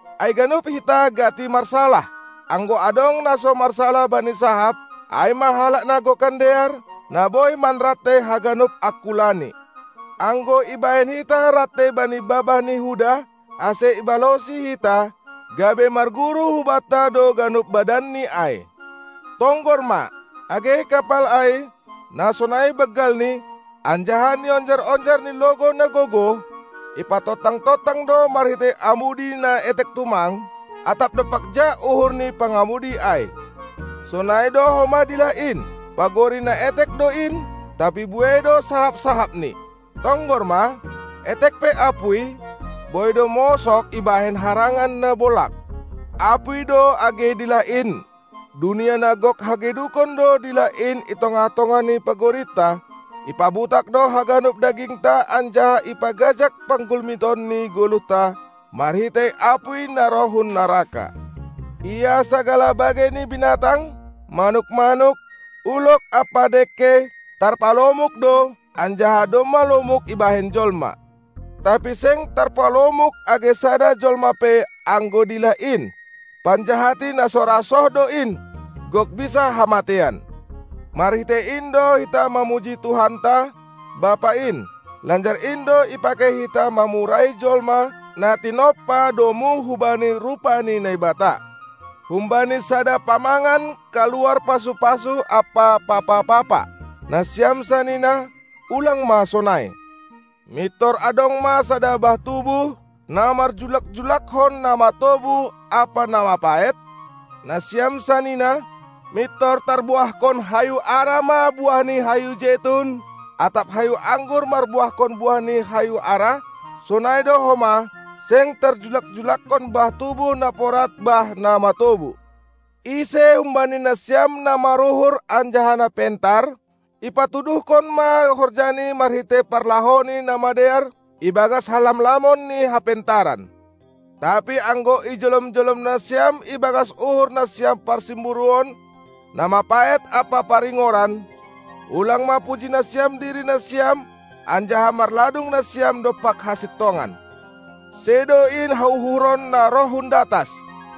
Ai ganup hita gati marsalah; anggo adong na so marsalah bani sahap, ai ma halak na gokan dear, na boi manrantei haganup angkulani. Anggo ibahen hita rantei bani babah ni huda, ase ibalosi hita, gabe marguru hubanta do ganup badanni ai. Tonggor ma, age kapal ai, na sonai banggalni, anjaha nionjar-onjar ni logou na gogoh, ipatontang-tontang do marhitei amudi na etek tumang, atap dompak ja uhur ni pangamudi ai. Sonai do homa dilah in, pagori na etek do in, tapi buei do sahap-sahapni. Tonggor ma, etek pe apuy, boi do mosog ibahen harangan na bolag. Apuy do age dilah in. Dunia na gok hagedukon do dilah in i tongah-tongah ni pagorinta, ipabutak do haganup dagingta anjaha ipagajag panggulmiton ni goluhta, marhitei apuy na roh hun naraka. Ia sagala bagei ni binatang, manuk-manuk, ulog ampa dengke tarpalomuk do, anjaha domma lomuk ibahen jolma, tapi seng tarpalomuk age sada jolma pe anggo dilah in, panjahati na so ra soh do in, gok bisa hamateian. Marhitei in do hita mamuji Tuhanta, Bapa in; lanjar in do ipakei hita mamurai jolma, na tinompa domu hubani rupa ni Naibata. Humbani sada pamangan kaluar pasu-pasu ampa papa-papa. Nasiam sanina, ulang ma sonai! Mintor adong ma sada bah tubuh, na marjullak-jullakkon na matobu ampa na mapaet? Nasiam sanina, mintor tarbuahkon hayu ara ma buah ni hayu jetun, atap hayu anggur marbuahkon buah ni hayu ara? Sonai do homa, seng tarjullak-jullakkon bah tubuh na porad bah na matobu. Ise humbani nasiam na maruhur anjaha na pentar? Ipatuduhkon ma horjani marhitei parlahouni na madear, ibagas halamlamon ni hapentaran. Tapi anggo ijolom-jolom nasiam ibagas uhur nasiam parsimburuon na mapaet ampa paringoran, ulang ma puji nasiam diri nasiam anjaha marladung nasiam dompak hasintongan. Sedo in hauhuron na roh hun datas;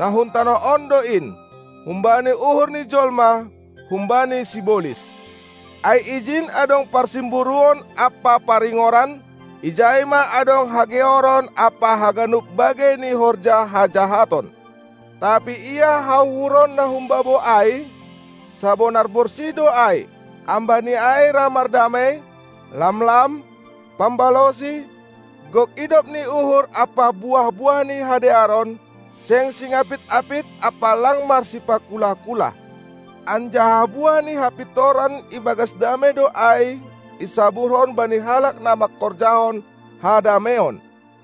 na hun tanoh on do in, humbani uhur ni jolma, humbani sibolis. Ai ijin adong parsimburuon ampa paringoran, ijai ma adong hageoron ampa haganup bagei ni horja hajahaton. Tapi ia hauhuron na humbabou ai sabonar borsih do ai, ambah ni ai ra mardamei, lamlam, pambalosi, gok idop ni uhur ampa buah-buah ni hadearon, seng singapit-apit ampa lang marsipakulah-kulah. Anjaha buah ni hapintoran ibagas damei do ai isaburhon bani halak na mangkorjahon hadameion.